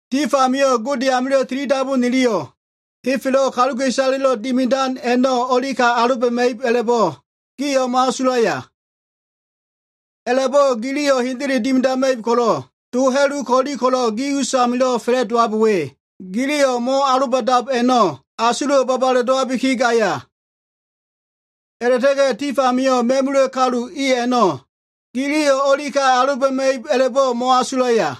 Tif amio꞉ Gode amilo꞉ tilidabu niliyo꞉ henfelo꞉ kaluka꞉isaleya꞉lo꞉ dimidan a꞉no꞉ o꞉lika aloba꞉ma꞉ib a꞉la꞉bo꞉ gio꞉ mo꞉asulaya? A꞉la꞉bo꞉ giliyo꞉ hendele dimidama꞉ib ko꞉lo꞉, to ha꞉lu ko꞉lo꞉ gi usamilo꞉ fa꞉la꞉dowab we, giliyo꞉ mo꞉aloba꞉dab a꞉no꞉, asulo꞉wo꞉ babale dowabiki gaya? A꞉la꞉ta꞉ga꞉ tif amio꞉ ma꞉mula꞉ kalu i a꞉no꞉ giliyo꞉ o꞉lika aloba꞉ma꞉ib a꞉labo꞉ mo꞉asulaya?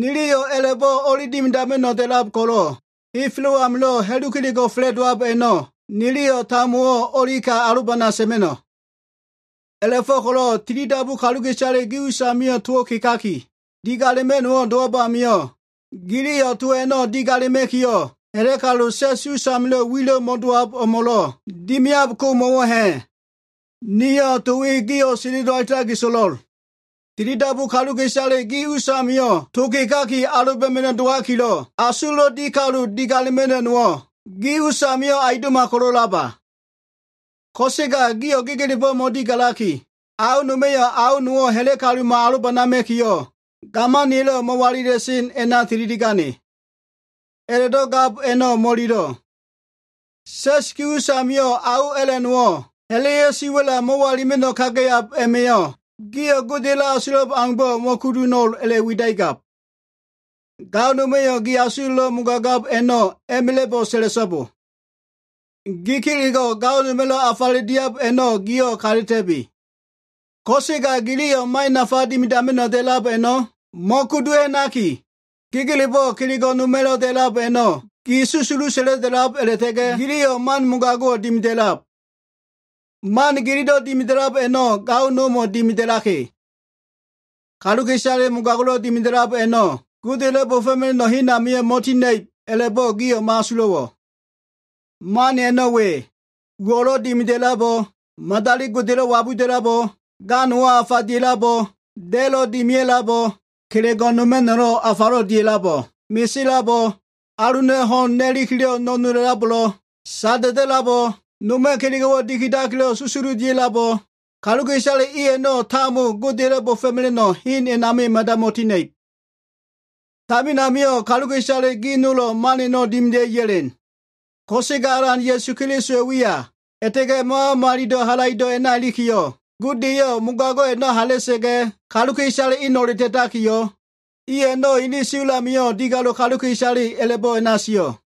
Niliyo꞉ a꞉la꞉bo꞉ o꞉li dimidama꞉no꞉ da꞉lab ko꞉lo꞉, henfelo꞉ amilo꞉ ha꞉lu kelego꞉ fa꞉la꞉dowab a꞉no꞉ niliyo꞉ tambowo꞉ o꞉lika alobana sa꞉ma꞉no꞉. A꞉la꞉fo꞉ko꞉lo꞉ tilidabu kaluka꞉isale gi usamio꞉ to kegaki, digalema꞉no꞉wo꞉ dowab amio꞉, giliyo꞉ to a꞉no꞉ digalema꞉kiyo꞉, ha꞉la꞉ kalu, sa꞉s us amilo꞉ wilo꞉ mo꞉da꞉lab o꞉mo꞉lo꞉ dimiab ko mo꞉wo꞉ ha꞉? Niyo꞉ to we gio꞉ sendelo alitaki so꞉lo꞉l. Tilidabu kaluka꞉isale gi us a꞉namio꞉ to kegaki aloba꞉ma꞉no꞉ dowalikilo꞉ asulo꞉lo꞉ di kalu digalema꞉no꞉ nowo꞉ gi us amio꞉ aundo꞉ma ko꞉lo꞉laba? Ko꞉sega gio꞉ gegelebo꞉ mo꞉digalaki, ao noma꞉yo꞉ ao nowo꞉ ha꞉la꞉ kalumo꞉ alobanama꞉kiyo꞉, gamaniya꞉lo꞉ mo꞉walila꞉sen a꞉na tililia꞉gane. A꞉la꞉do꞉ gab a꞉no꞉ mo꞉ililo꞉. Sa꞉s gi us amio꞉ ao a꞉la꞉ nowo꞉ ha꞉la꞉ya꞉ siwa꞉la mo꞉walilima꞉no꞉ kagayab a꞉ma꞉yo꞉, gio꞉ Godeya꞉lo꞉ asulab aumbo꞉ mo꞉kudu ho꞉no꞉l a꞉la꞉widakigab. Gao noma꞉yo꞉ gi asulo꞉lo꞉ mogagab a꞉no꞉ a꞉ma꞉la꞉bo꞉ sa꞉la꞉so꞉bo. Gi kelego꞉ gao noma꞉lo꞉ afaledo꞉ diab a꞉no꞉ gio꞉ kata꞉ta꞉bi. Ko꞉sega giliyo꞉ man nafa dimidama꞉no꞉ da꞉lab a꞉no꞉ mo꞉kudu ha꞉naki, gegelebo꞉ kelego꞉ noma꞉lo꞉ da꞉lab a꞉no꞉ gi susulu sa꞉la꞉la꞉lab a꞉la꞉ta꞉ga꞉, giliyo꞉ man mogago꞉wo꞉ dimida꞉lab. Man gililo꞉ dimidab a꞉no꞉ gaomo꞉ dimida꞉laka꞉. Kaluka꞉isale mogago꞉lo꞉ dimida꞉lab a꞉no꞉ Godeya꞉lo꞉ bo꞉fo꞉mela꞉no꞉ hen a꞉namio꞉ mo꞉tina꞉ib a꞉la꞉bo꞉ gio꞉ mo꞉asulo꞉wo꞉? Man a꞉no꞉ we, uwo꞉lo꞉ dimida꞉labo꞉, madali godelo꞉ wabuda꞉labo꞉, ga nowo꞉ afa dia꞉labo꞉, da꞉lo꞉ dimia꞉labo꞉, kelego꞉ noma꞉no꞉lo꞉ afalo꞉ dia꞉labo꞉, mesela꞉labo꞉, aluna꞉ ho꞉n na꞉likilo꞉ no꞉nola꞉labo꞉, sada꞉da꞉labo꞉, noma꞉ kelego꞉wo꞉ dikidakilo꞉ susulu dia꞉labo꞉, kaluka꞉isale i a꞉no꞉ tambo Godeya꞉lo꞉ bo꞉fo꞉mela꞉no꞉ hen a꞉namio꞉ mada mo꞉tina꞉ib. Tamin amio꞉ kaluka꞉isale gi nolo꞉ man a꞉no꞉ dimida꞉i ya꞉len. Ko꞉sega Alan Ya꞉su Kelisowa꞉ wiya, a꞉la꞉ta꞉ga꞉ Mama Malilo꞉ halaido꞉ a꞉na ilikiyo꞉, Gode eyo꞉ mogago꞉ a꞉no꞉ hala꞉sa꞉ga꞉, kaluka꞉isale eno꞉le ta꞉takiyo꞉, i a꞉no꞉ ene siwa꞉l amio꞉ digalo꞉ kaluka꞉isale a꞉la꞉bo꞉ a꞉na sio꞉.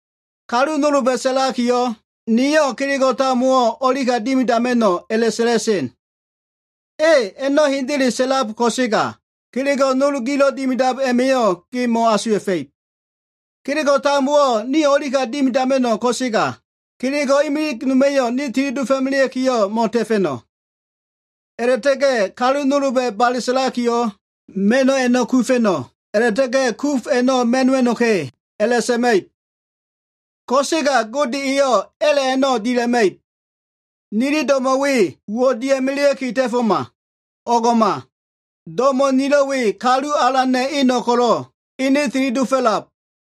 Kalu nolba꞉ sa꞉lakiyo꞉, “Niyo꞉ kelego꞉ tambowo꞉ o꞉lika dimidama꞉no꞉” a꞉la꞉sa꞉la꞉sen. A꞉, a꞉no꞉ hendele sa꞉lab ko꞉sega, kelego꞉ nol gilo꞉ dimidab a꞉ma꞉yo꞉ ge mo꞉asuwa꞉fa꞉ib. “Kelego꞉ tambowo꞉ niyo꞉ o꞉lika dimidama꞉no꞉,” ko꞉sega kelego꞉ imilig noma꞉yo꞉ ne tili dofo꞉ melea꞉kiyo꞉ mo꞉ta꞉fa꞉no꞉. A꞉la꞉ta꞉ga꞉ kalu nolba꞉ bale sa꞉lakiyo꞉, “Ma꞉no꞉ a꞉no꞉ kufa꞉no꞉, a꞉la꞉ta꞉ga꞉ kuf a꞉no꞉ ma꞉no꞉wa꞉no꞉ka꞉” a꞉la꞉sa꞉ma꞉ib. Ko꞉sega Gode eyo꞉ a꞉la꞉ a꞉no꞉ dila꞉ma꞉ib. Nili do꞉mo꞉ we uwo꞉ dia꞉melea꞉ki ta꞉foma. O꞉ngo꞉ma. Do꞉mo꞉ nilo꞉ we Kalu Alana꞉ eno꞉ ko꞉lo꞉, ene tili dofo꞉lab.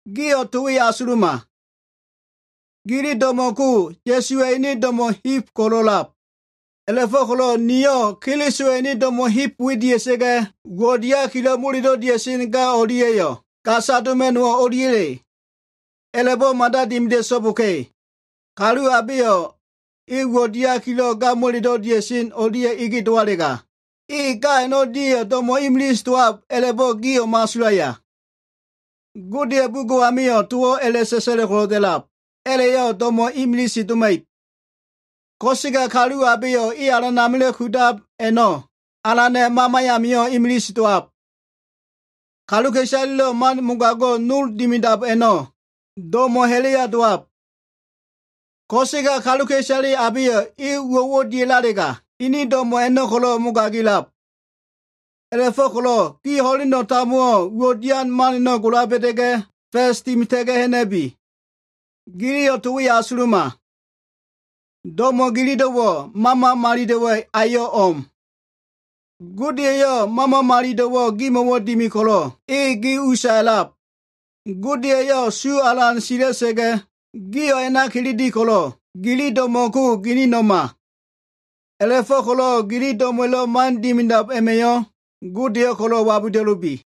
Gio꞉ to we asuluma. Gili do꞉mo꞉ ko Ya꞉suwa꞉ ene do꞉mo꞉ heb ko꞉lo꞉ a꞉lab. A꞉la꞉fo꞉ko꞉lo꞉ niyo꞉ Kelisowa꞉ ene do꞉mo꞉ heb we dia꞉sa꞉ga꞉, uwo꞉ diakilo꞉ molelo꞉ dia꞉sen ga o꞉lia꞉yo꞉ gasa doma꞉no꞉wo꞉ o꞉liya꞉le? A꞉la꞉bo꞉ mada dimida꞉so꞉boka꞉! Kalu abeyo꞉ e uwo꞉ diakilo꞉ molelo꞉ dia꞉sen ga o꞉lia꞉ ege dowalega, e ga a꞉no꞉lia꞉yo꞉ do꞉mo꞉ imilise dowab a꞉la꞉bo꞉ gio꞉ mo꞉asulaya? Godeya꞉ bugo꞉ amio꞉ towo꞉ a꞉la꞉sa꞉sa꞉lo꞉ ko꞉lo꞉ da꞉lab, “A꞉la꞉yo꞉ do꞉mo꞉ imilise doma꞉ib.” Ko꞉sega kalu abeyo꞉ e Alan amilo꞉ kudab a꞉no꞉, Alana꞉ mama amio꞉ imilise dowab. Kaluka꞉isalelo꞉ man mogago꞉ nol dimidab a꞉no꞉ do꞉mo꞉ ha꞉la꞉ya dowab. Ko꞉sega kaluka꞉isale abeyo꞉ e uwo꞉wo꞉ dialega, ene do꞉mo꞉ a꞉no꞉ ko꞉lo꞉ mogagilab. A꞉la꞉fo꞉ko꞉lo꞉ gio꞉ ho꞉leno꞉ tambowo꞉ uwo꞉ dian man a꞉no꞉ gola ba꞉da꞉ga꞉, fa꞉s dimita꞉ga꞉ ha꞉na꞉bi. Giliyo꞉ to we asuluma. Do꞉mo꞉ gililo꞉wo꞉ Mama Malilo꞉wa꞉ ayo꞉ o꞉m. Gode eyo꞉ Mama Malilo꞉wo꞉ gimo꞉ dimi ko꞉lo꞉, e gi usa a꞉lab. Gode eyo꞉ su alan sila꞉sa꞉ga꞉, gio꞉ a꞉na kilili ko꞉lo꞉, gili do꞉mo꞉ ko gilino꞉ma. A꞉la꞉fo꞉ko꞉lo꞉ gili do꞉mo꞉wa꞉lo꞉ man dimidab a꞉ma꞉yo꞉ Godeyo꞉ ko꞉lo꞉ wabuda꞉lubi.